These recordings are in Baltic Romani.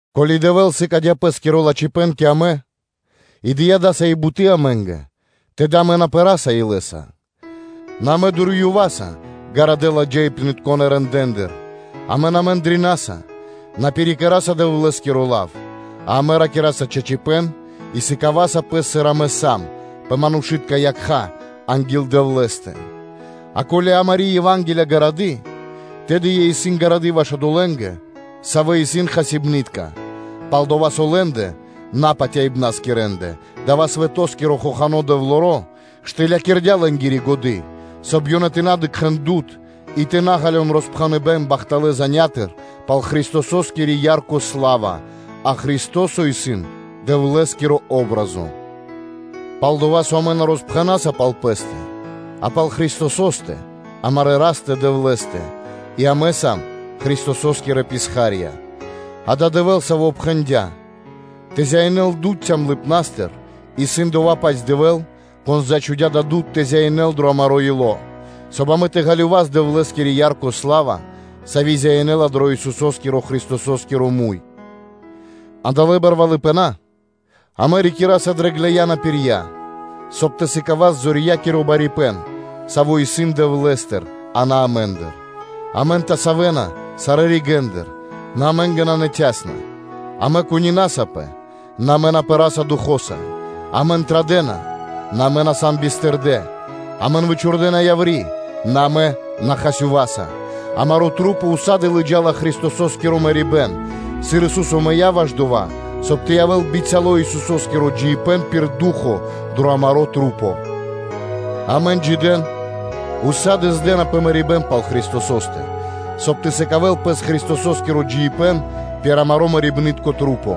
Ко́ли Дэвэ́л сыкадя́ Пэ́скиро лачхипэ́н кэ амэ и дыя́ дасави́ буты́ амэ́нгэ, тэды амэ на пэраса илэ́са. Нэ амэ дурьёваса ґарадэ́ ладжаипнытконэ рэндэ́ндыр, амэ на мэндринаса, на пирикэраса Дэвлэ́скиро лав, а амэ ракираса чачипэ́н и сыкаваса пэс, сыр амэ сам, пэ манушы́тка якха́ анги́л Дэвлэ́стэ. А ко́ли амари́ Ева́нгелия исын гарады, тэды ёй исын ґарады ваш одолэ́нгэ, савэ́ исын хасибны́тка, пал-дова́ со лэ́ндэ, напатяибнаскирэндэ, дава́ свэтоскиро хохано́ дэвлоро штылякирдя лэ́нгири годы́, соб (кай) ёнэ тэ на дыкхэ́н дуд (свэ́то) и тэ на ґалён роспхэныбэн пал бахталы́ зан (звесь) пал Христососкири ярко сла́ва, а Христо́со исын Дэвлэ́скири патри́н (о́бразо). Пал-дова́ со амэ на роспхэнаса пал пэ́стэ, а пал Христосо́стэ, амарэ́ Растэ-Дэвлэ́стэ, и амэ сам Христосо́скирэ писха́рья. Адава́ исын Дэвэ́л, Саво́ пхэндя́: “Тэ зяинэл дуд (свэ́то) цямлыпнастыр”, исын дова́-паць Дэвэ́л, Кон зачхудя дава́ дуд тэ зяинэл дро амаро́ ило́, соб (кай) амэ тэ ґалёвас Дэвлэ́скири ярко сла́ва, сави́ зяинэла Исусо́стыр Христосостыр. А дава́ кучипэ́н амэ рикираса дрэ ґлэя́на (глины́тка) пирья, соб (кай) тэ сыкавас зорьякиро барипэ́н, саво́ исын Дэвлэ́стыр, а на амэ́ндыр: амэн тасавэна сарэ́ ригэ́ндыр, нэ амэ́нгэ нанэ цясно (танго); амэ кунинасапэ, нэ амэ на пэраса Духо́са; амэн традэ́на, нэ амэ на сам бистырдэ; амэн вычхурдэна яври́, нэ амэ на хасёваса. Амэ дрэ маса́ ўса́ды (сак) лыджа́са Христосо́скиро мэрибэ́н дрэ пэ́стэ, сыр Ису́со мыя́ ваш дова́, соб (кай) тэ явэ́л бицяло́ Исусо́скиро джиибэ́н пир ду́хо (фа́но) дрэ амэ́ндэ. Амэн джидэн ўса́ды (сак) здэна пэ мэрибэ́н пал Христосо́стэ, соб (кай) тэ сыкадёл Христосо́скиро джиибэ́н пир амари́ лоч (плоть), сави́ мэрэ́ла.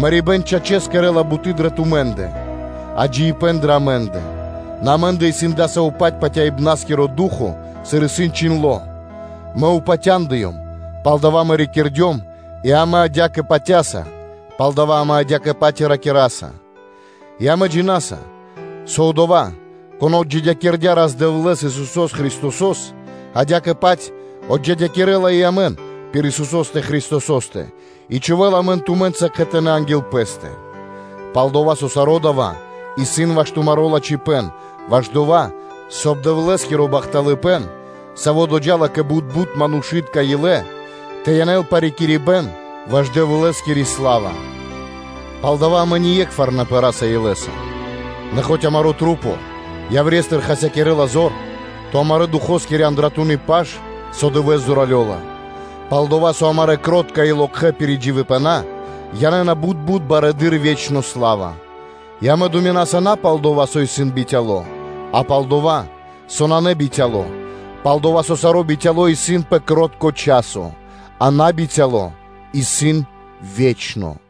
Мэрибэ́н, чачэс, кэрэ́ла буты́ дрэ тумэ́ндэ, а джиибэ́н дрэ амэ́ндэ. Нэ амэ́ндэ исын дасаво-паць патяибнаскиро ду́хо (фа́но), сыр исын чхиндло́: “Мэ упатяндыём, палдава́ мэ ракирдём” и амэ адя́кэ патя́са, палдава́ амэ адя́кэ-паць и ракираса, и амэ джина́са, со Одова́, Кон отджидякирдя́ Рас-Дэвлэ́с, Исусо́с Христосо́с, адя́кэ-паць отджидякирэла и амэн пир Исусо́стэ Христосо́стэ и чхувэ́ла амэн тумэ́нца кхэтанэ́ анги́л Пэ́стэ. Пал-дова́ со саро́ дава́ исын ваш тумаро́ лачхипэ́н ваш дова́, соб (кай) Дэвлэ́скиро бахталыпэ́н, саво́ доджа́ла кэ бут-бут манушы́тка илэ, тэ янэл парикирибэн ваш Дэвлэ́скири сла́ва. Палдава́ амэ ние́кхвар на пэраса дро ило́. Нэ хоць амарэ́ маса́ яврестыр хасякирэна зор, то амарэ́-Духоскири андратуны́ паш со дывэ́с зоралёла. Пал-дова́ со амарэ́ кро́тка и локхэ́ пиридживибэна янэ́на бут-бут барэды́р ве́чно сла́ва, и амэ думинаса на пал дова́, со исын бицяло́, а пал дова́, со нанэ бицяло́; пал-дова́ со саро́ бицяло́ исын пэ наборо (кротко) часо, а набицяло исын ве́чно.